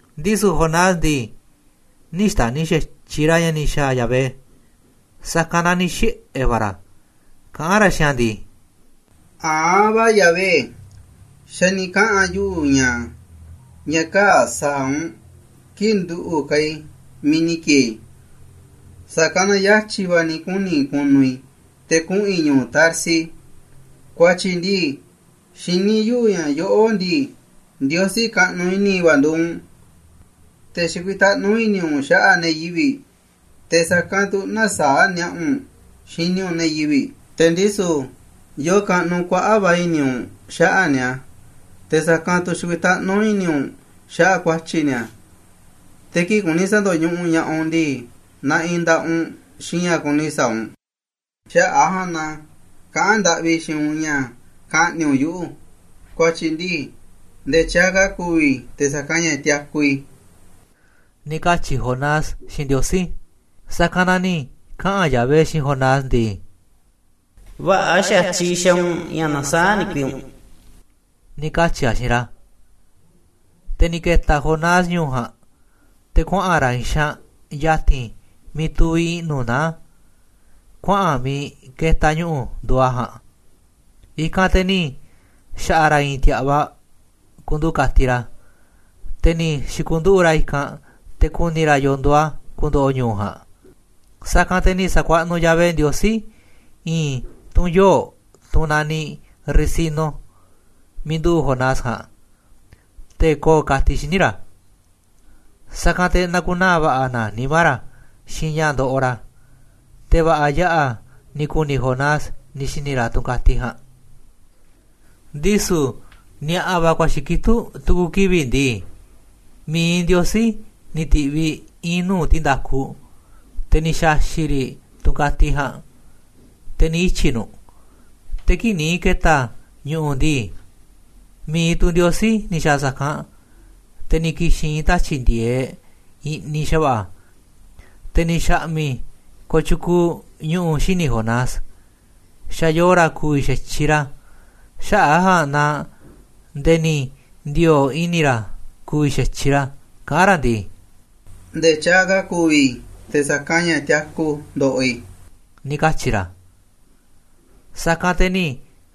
Ndisu̱ Jonás ndii, nï̱ xta̱ni̱ xa̱tyiꞌ ra̱ ña̱ ni̱ xa̱a̱ Yahvé, sa̱kanꞌ na ni̱ xiꞌe̱ va̱ ra̱, kaꞌán ra̱ xiinꞌ a̱ ndii: ―A̱anꞌ va̱ Yahvé, xa̱ ni̱ kaꞌa̱n yuꞌu̱ ña̱, ña̱ kaa̱ꞌ sa̱a̱ u̱nꞌ, kii̱ꞌ nduꞌu̱ ka̱ i̱ miiꞌ ni̱ ki̱e̱e̱ i̱. Sa̱kanꞌ na yatyi̱ va̱ ni̱ kuni̱ i̱ ku̱nu̱ i̱ te̱ kuꞌu̱n i̱ ñu̱u̱ Tarsis. Kua̱tyi̱ ndii, xiní yuꞌu̱ ña̱ yoꞌó ndii, Ndiosí kaꞌnuꞌ i̱ni̱ va̱ nduuꞌ u̱nꞌ, te̱ xikuitaꞌnú i̱ni̱ u̱nꞌ xaꞌa̱ꞌ ne̱ yivi̱ꞌ, te̱ sa̱kanꞌ tu̱ nä̱saa̱ꞌ ni̱a̱ꞌa̱ u̱nꞌ xini u̱nꞌ ne̱ yivi̱ꞌ, te̱ ndisu̱ yoo kaꞌnuꞌ kuaꞌa̱ꞌ va̱ i̱ni̱ u̱nꞌ xaꞌa̱ꞌ ni̱a̱, te̱ sa̱kanꞌ tu̱ xikuitaꞌnú i̱ni̱ u̱nꞌ xaꞌa̱ꞌ kua̱tyi̱ ni̱a̱, te̱ kii̱ꞌ kuni sa̱ndo̱ñuꞌuꞌ ña̱ꞌaꞌ u̱nꞌ ndii, naꞌinꞌ nda̱ꞌaꞌ u̱nꞌ xiinꞌ ña̱ kuni sa̱a̱ u̱nꞌ. Xaꞌa̱ꞌ a̱ ja̱a̱nꞌ na kaꞌán ndaꞌvi i̱ xiinꞌ u̱nꞌ ña̱ ka̱ꞌni̱ꞌ u̱nꞌ yuꞌu̱, kua̱tyi̱ ndii nde̱e̱ tyaaꞌ ka̱ ku̱vi̱ i̱ te̱ sa̱kanꞌ ña̱ tiaku i̱ ―ni̱ katyi̱ Jonás xiinꞌ Ndiosí. Sa̱kanꞌ na ni̱ kaꞌa̱n Yahvé xiinꞌ Jonás ndii: ―Vä̱ꞌa̱ xa̱tyiꞌ xaaꞌ u̱nꞌ ña̱ nasaáꞌ ndikui u̱nꞌ ―ni̱ katyi̱ a̱ xiinꞌ ra̱. Te̱ ni̱ ke̱ta̱ Jonás ñu̱u̱ ja̱a̱nꞌ, te̱ kuaꞌa̱n ra̱ i̱i̱n xaanꞌ ya̱ti̱n miiꞌ tuviꞌ i̱ꞌnu̱ naá a̱, kuaꞌa̱n miiꞌ ketaꞌ ñu̱ꞌu̱ nduuꞌ a̱ ja̱a̱nꞌ. I̱kanꞌ te̱ ni̱ xa̱ꞌa̱ ra̱ i̱i̱n ti̱a̱ꞌvaꞌ ku̱ndu̱u̱ ka̱tiꞌ ra̱, te̱ ni̱ xi̱ku̱nduꞌu̱ꞌ ra̱ i̱kanꞌ te̱ ku̱ni̱ ra̱ yo̱o̱ nduuꞌ a̱ ku̱ndo̱ꞌo̱ ñu̱u̱ ja̱a̱nꞌ. Sa̱kanꞌ te̱ ni̱ sa̱kuaꞌnuꞌ Yahvé Ndiosí i̱i̱n tunꞌ yoo̱, tunꞌ naniꞌ ricino, miiꞌ nduꞌu̱ꞌ Jonás ja̱a̱nꞌ, te̱ ko̱o̱ ka̱tiꞌ xíniꞌ ra̱. Sa̱kanꞌ te̱ na̱ku̱naa̱ va̱ꞌa̱ na nimá ra̱ xiinꞌ ña̱ ndoꞌoꞌ ra̱. Te̱ va̱ꞌa̱ yaꞌa̱ ni̱ ku̱ni̱ Jonás ni̱ xi̱ni̱ ra̱ tunꞌ ka̱tiꞌ ja̱a̱nꞌ. Ndisu̱ ni̱a̱ꞌa̱ va̱ kua̱xi̱ kitúꞌ tu̱ku̱ kivi̱ꞌ ndii, mi̱iꞌ Ndiosí ni̱ ti̱ꞌviꞌ i̱i̱n nuu̱ꞌ ti̱nda̱kuꞌ te̱ ni̱ xa̱xi̱ꞌ riꞌ tunꞌ ka̱tiꞌ ja̱a̱nꞌ, te̱ ni̱ ityi̱ nu̱ꞌ. Te̱ kii̱ꞌ ni̱ ke̱ta̱ ñu̱ꞌu̱ ndii, mi̱iꞌ tu̱ Ndiosí ni̱ xa̱a̱ sa̱kanꞌ te̱ ni̱ ki̱xi̱n i̱i̱n tatyi̱ꞌ ndi̱e̱eꞌ i̱ꞌniꞌ xa̱va̱ꞌa̱, te̱ ni̱ xa̱ꞌmi̱ kooꞌ tyukuuꞌ ñu̱ꞌu̱ xíniꞌ Jonás, xa̱ yooꞌ ra̱ ku̱vi̱ xa̱tyiꞌ ra̱, xaꞌa̱ꞌ a̱ ja̱a̱nꞌ naaꞌ nde̱e̱ ni̱ ndi̱o̱o̱ꞌ i̱ni̱ ra̱ ku̱vi̱ xa̱tyiꞌ ra̱, kaꞌán ra̱ ndii: ―Nde̱e̱ tyaaꞌ ka̱ ku̱vi̱ i̱ te̱ sa̱kanꞌ ña̱ tiaku ndoꞌoꞌ i̱ ―ni̱ katyi̱ ra̱. Sa̱kanꞌ te̱ ni̱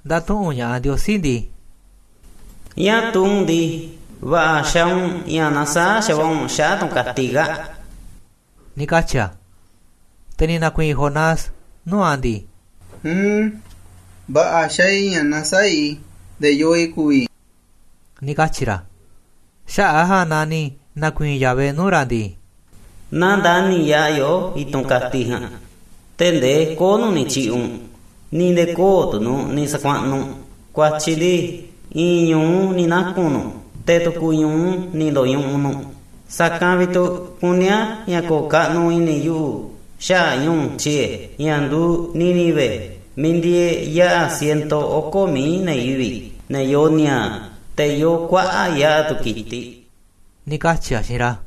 nda̱tuꞌu̱nꞌ ña̱ꞌaꞌ Ndiosí ndii: ―¿Ñáá tuu u̱nꞌ ndii, va̱ꞌa̱ xaaꞌ u̱nꞌ ña̱ nasaáꞌ xa̱va̱ꞌa̱ u̱nꞌ xaꞌa̱ꞌ tunꞌ ka̱tiꞌ kaa̱ꞌ? ―ni̱ katyi̱ a̱. Te̱ ni̱ na̱kui̱i̱n Jonás nuu̱ꞌ a̱ ndii: ―Uun, va̱ꞌa̱ xaaꞌ i̱ ña̱ nasaáꞌ i̱ nde̱e̱ yoo i̱ ku̱vi̱ i̱ ―ni̱ katyi̱ ra̱. Xaꞌa̱ꞌ a̱ ja̱a̱nꞌ naaꞌ ni̱ na̱kui̱i̱n Yahvé nuu̱ꞌ ra̱ ndii: ―Naaꞌ ndani̱ yaꞌa̱ yoꞌó i̱tunꞌ ka̱tiꞌ ja̱a̱nꞌ, tee̱ꞌ ndee kö̱o̱ꞌ nu̱ꞌ ni̱ tyi̱ꞌi̱ꞌ u̱nꞌ, ni̱ nde̱e̱ kö̱o̱ꞌ tu̱ nu̱ꞌ ni̱ sa̱kuaꞌnuꞌ u̱nꞌ, kua̱tyi̱ ndii, i̱i̱n ñu̱u ni̱ naku̱n nu̱ꞌ, te̱ tu̱ku̱ ñu̱u ni̱ ndo̱ñuꞌuꞌ nu̱ꞌ. Sa̱a̱ ka̱ vi̱ꞌ tu̱ kuní a̱ ña̱ ko̱o̱ kaꞌnuꞌ i̱ni̱ yuꞌu̱ xaꞌa̱ꞌ ñu̱u̱ tyie̱, ña̱ nduuꞌ Nínive, miiꞌ ndieeꞌ yaꞌa̱ ciento oko̱ mií ne̱ yivi̱ꞌ, ne̱ yoo ni̱a̱a̱ꞌ, te̱ yoo kuaꞌa̱ꞌ yaꞌa̱ tu̱ ki̱tiꞌ ―ni̱ katyi̱ a̱ xiinꞌ ra̱.